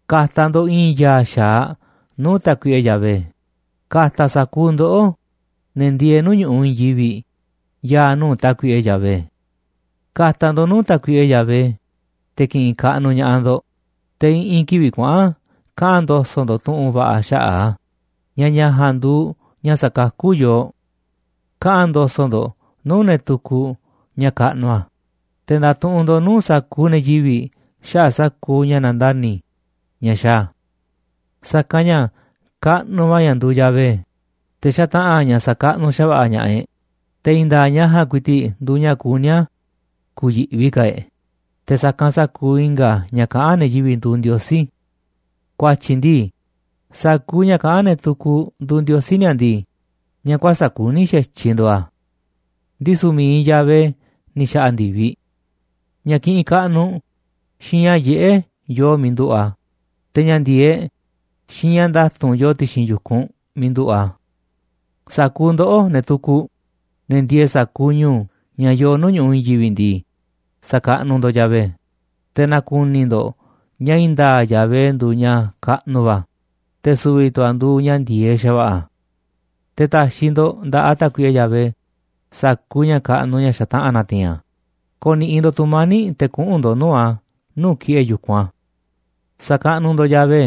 Ka̱ta̱ ndo̱ꞌ i̱i̱n ya̱a̱ xa̱aꞌ nuu̱ꞌ Tákuiꞌe Yahvé, ka̱ta̱ sa̱kuuꞌ ndoꞌó, ne̱ ndieeꞌ nuu̱ꞌ ñu̱ꞌuꞌ i̱i̱n yivi̱ꞌ, ya̱a̱ nuu̱ꞌ Tákuiꞌe Yahvé. Ka̱ta̱ ndo̱ꞌ nuu̱ꞌ Tákuiꞌe Yahvé, te̱ ki̱ꞌi̱n kaꞌnuꞌ ña̱ꞌaꞌ ndo̱ꞌ, te̱ i̱ꞌi̱n kivi̱ꞌ kuaꞌa̱n kaꞌa̱n ndo̱so̱ꞌ ndo̱ꞌ tu̱ꞌu̱n va̱ꞌa̱ xaꞌa̱ꞌ a̱, ña̱ ña̱ ja̱a̱nꞌ nduuꞌ ña̱ sakakú yooꞌ. Kaꞌa̱n ndo̱so̱ꞌ ndo̱ꞌ nuu̱ꞌ ne̱ tukuꞌ ña̱ kaꞌnuꞌ a̱, te̱ nda̱tuꞌunꞌ ndo̱ꞌ nuu̱ꞌ sa̱kuuꞌ ne̱ yivi̱ꞌ xaꞌa̱ꞌ sa̱kuuꞌ ña̱ nandani̱ ña̱ xaaꞌ a̱. Sa̱kanꞌ ña̱ kaꞌnuꞌ va̱ ña̱ nduuꞌ Yahvé, te̱ xataꞌa̱n ña̱ sa̱kaꞌnuꞌ xa̱va̱ꞌa̱ ña̱ꞌaꞌ e̱ꞌ, te̱ i̱i̱n nda̱a̱ꞌ ña̱ ja̱a̱nꞌ ku̱i̱ti̱ꞌ nduuꞌ ña̱ kuní a̱ ku̱yi̱ꞌvi ka̱ e̱ꞌ te̱ sa̱kanꞌ sa̱kuuꞌ i̱nga̱ ña̱ kaꞌán ne̱ yivi̱ꞌ nduuꞌ ndiosí. Ku̱a̱tyi̱ ndii, sa̱kuuꞌ ña̱ kaꞌán ne̱ tukuꞌ nduuꞌ ndiosí ni̱a̱ ndii, ña̱ kuäsa̱ꞌ kuní xa̱tyiꞌ nduuꞌ a̱. Ndisu̱ mi̱iꞌ Yahvé ni̱ xa̱ꞌa̱ ndi̱viꞌ. Ña̱ kiꞌinꞌ kaꞌnuꞌ xiinꞌ ña̱ yiꞌé yoo miiꞌ nduꞌu̱ꞌ a̱, te̱ ña̱ ndi̱e̱eꞌ xiinꞌ ña̱ nda̱tu̱nꞌ yooꞌ ti̱xi̱n yu̱kunꞌ miiꞌ nduꞌu̱ꞌ a̱. Sa̱kuuꞌ ndoꞌó, ne̱ tukuꞌ, ne̱ ndieeꞌ sa̱kuuꞌ ñu̱u̱ ña̱ yoo nuu̱ꞌ ñu̱ꞌuꞌ i̱i̱n yivi̱ꞌ ndii, sa̱kaꞌnuꞌ ndo̱ꞌ Yahvé, te̱ na̱ku̱ni̱ ndo̱ꞌ ña̱ i̱i̱n nda̱a̱ꞌ Yahvé nduuꞌ ña̱ kaꞌnuꞌ va̱, te̱ su̱vi̱ tu̱ a̱ nduuꞌ ña̱ ndi̱e̱eꞌ xa̱va̱ꞌa̱. Te̱ ta̱xi̱ ndo̱ꞌ nda̱ꞌaꞌ Tákuiꞌe Yahvé sa̱kuuꞌ ña̱ kaꞌnuꞌ ña̱ xataꞌa̱n na̱ti̱i̱n a̱, ko̱ni̱ꞌi̱ ndo̱ꞌ tu̱mani̱ꞌ te̱ kuꞌu̱n ndo̱ꞌ nuu̱ꞌ a̱ nuu̱ꞌ ki̱ꞌe̱ yu̱kunꞌ a̱. Sa̱kaꞌnuꞌ ndo̱ꞌ Yahvé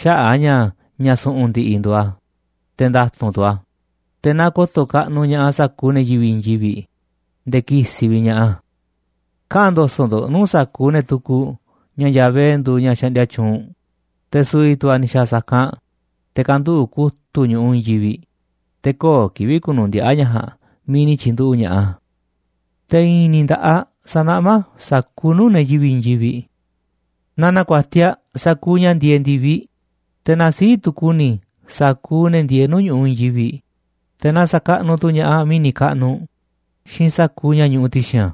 xaꞌa̱ꞌ a̱ ña̱ ña̱ su̱ꞌu̱n ndi̱ꞌi̱ nduuꞌ a̱, te̱ nda̱tu̱nꞌ tu̱ a̱, te̱ na ko̱to̱ kaꞌnuꞌ ña̱ꞌaꞌ sa̱kuuꞌ ne̱ yivi̱ꞌ i̱i̱n yivi̱ꞌ nde̱e̱ ki̱si̱ vi̱ꞌ ña̱ꞌaꞌ a̱. Kaꞌa̱n ndo̱so̱ꞌ ndo̱ꞌ nuu̱ꞌ sa̱kuuꞌ ne̱ tukuꞌ ña̱ Yahvé nduuꞌ ña̱ xaꞌndia tyuunꞌ, te̱ su̱vi̱ tu̱ a̱ ni̱ xa̱a̱ sa̱kanꞌ te̱ kanduꞌu̱ꞌ kutu̱ꞌ ñu̱ꞌuꞌ i̱i̱n yivi̱ꞌ, te̱ köo̱ꞌ kivi̱ꞌ ku̱nu̱ndiaꞌa̱ ña̱ ja̱a̱nꞌ miiꞌ ni̱ tyi̱nduꞌu̱ꞌ ña̱ꞌaꞌ a̱. Te̱ i̱i̱n ni̱ nda̱ꞌaꞌ sa̱naꞌmá a̱ sa̱kuuꞌ nuu̱ꞌ ne̱ yivi̱ꞌ i̱i̱n yivi̱ꞌ. Na na̱ku̱a̱tiaꞌ sa̱kuuꞌ ña̱ ndieeꞌ ndi̱viꞌ, te̱ na sii̱ꞌ tu̱ ku̱ni̱ sa̱kuuꞌ ne̱ ndieeꞌ nuu̱ꞌ ñu̱ꞌuꞌ i̱i̱n yivi̱ꞌ, te̱ na sa̱kaꞌnuꞌ tu̱ ña̱ꞌaꞌ mi̱ni̱ kaꞌnuꞌ xiinꞌ sa̱kuuꞌ ña̱ ñuꞌuꞌ ti̱xi̱n a̱.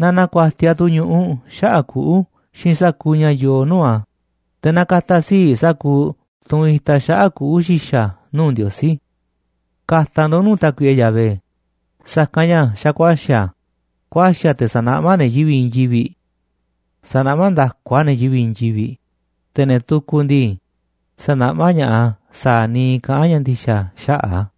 Na na̱ku̱a̱tiaꞌ tu̱ ñu̱ꞌuꞌ xaꞌa̱ꞌ kuꞌu̱ xiinꞌ sa̱kuuꞌ ña̱ yoo nuu̱ꞌ a̱, te̱ na ka̱ta̱ sii̱ꞌ sa̱kuuꞌ tunꞌ itaꞌ xaꞌa̱ꞌ kuꞌu̱ xi̱xa̱ nuu̱ꞌ Ndiosí. Ka̱ta̱ ndo̱ꞌ nuu̱ꞌ Tákuiꞌe Yahvé, sa̱kanꞌ ña̱ xa̱ ku̱a̱xi̱ a̱, ku̱a̱xi̱ a̱ te̱ sa̱naꞌmá a̱ ne̱ yivi̱ꞌ i̱i̱n yivi̱ꞌ. Sa̱naꞌmá nda̱ku a̱ ne̱ yivi̱ꞌ i̱i̱n yivi̱ꞌ, te̱ ne̱ tukuꞌ ndii, sa̱naꞌmá ña̱ꞌaꞌ a̱ sa̱a̱ niiꞌ kaꞌán ña̱ ndi̱xa̱ xaꞌa̱ꞌ a̱.